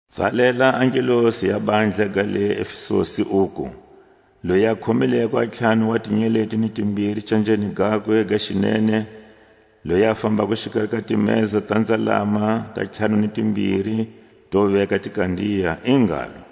Tsalela a ngelosi ya bandla ga le Efesusi, uku: Loyi a khomileko a ntlhanu wa tinyeleti ni timbiri canjeni gakwe ga xinene, loyi a fambako xikari ka timeza ta nzalama ta ntlhanu ni timbiri to veka tikandiya, i ngalo: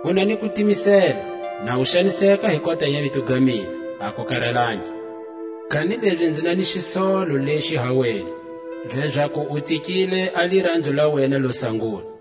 U na ni kutimisela, na u xaniseka hi kota ya vito ga mina, a ku karatangi. Kanilezi nzi na ni xisolo lexi ha wena, lezaku u tsikile a liranzo la wena lo sangula.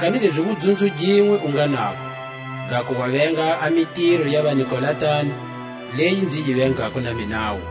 Kanilezi wudzunzo ginwe u nga nago, gaku wa venga a mitiro ya vaNikolatani, leyi nzi yi vengako na minawu.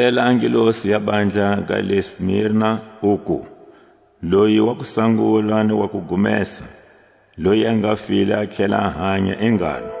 Tsalela a ngelosi ya bandla ga le Smirna, uku: Loyi wa kusangula ni wa kugumesa, loyi a nga file a tlhela a hanya, i ngalo: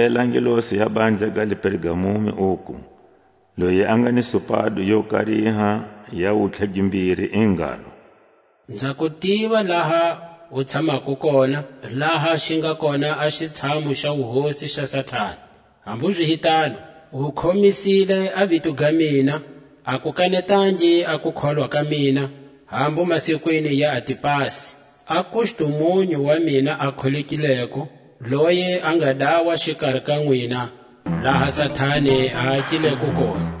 Tsalela a ngelosi ya bandla ga le Pergamumi, uku: Loyi a nga ni supado yo kariha ya wutlha gimbiri, i ngalo: Nza ku tiva laha u tshamako kona, laha xi nga kona a xitshamu xa wuhosi xa Satani. Hambu zi hi tano, u khomisile a vito ga mina, a ku kanetangi a kukholwa ka mina, hambu masikwini ya Antipasi, a kustumunyu wa mina a kholekileko, loyi a nga dawa xikari ka nwina, laha Satani a akileko kona.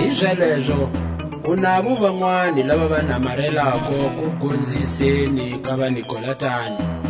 Hizalezo u navo vanwani lava va namarelako kugonziseni ka vaNikolatani.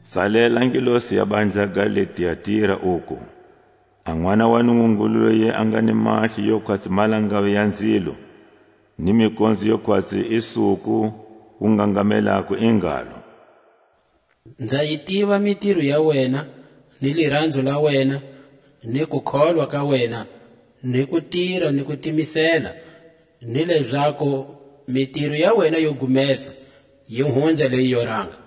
Tsalela a ngelosi ya bandla ga le Tiatira, uku: A Nʼwana wa Nungungulu loyi a nga ni mahlo yo khwatsi malangavi ya nzilo, ni mikonzo yo khwatsi i suku wu ngangamelako, i ngalo: Nza yi tiva mitiro ya wena, ni liranzo la wena, ni kukholwa ka wena ni kutira ni kutimisela, ni lezaku mitiro ya wena yo gumesa yi hunza leyi yo ranga.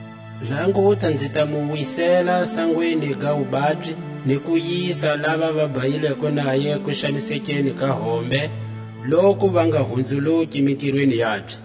Languta, nzi ta mu wisela sangweni ga wubabyi, ni ku yisa lava va bhayileko naye kuxanisekeni ka hombe, loku va nga hunzuluki mitirweni yakwe.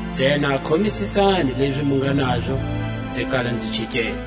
ntsena khomisisani lezi mu nga nazo nzi kala nzi chikela.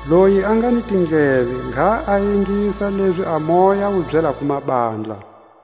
Loyi a nga ni tindleve, ngha a ingisa lezi a Moya wu byelako mabandla.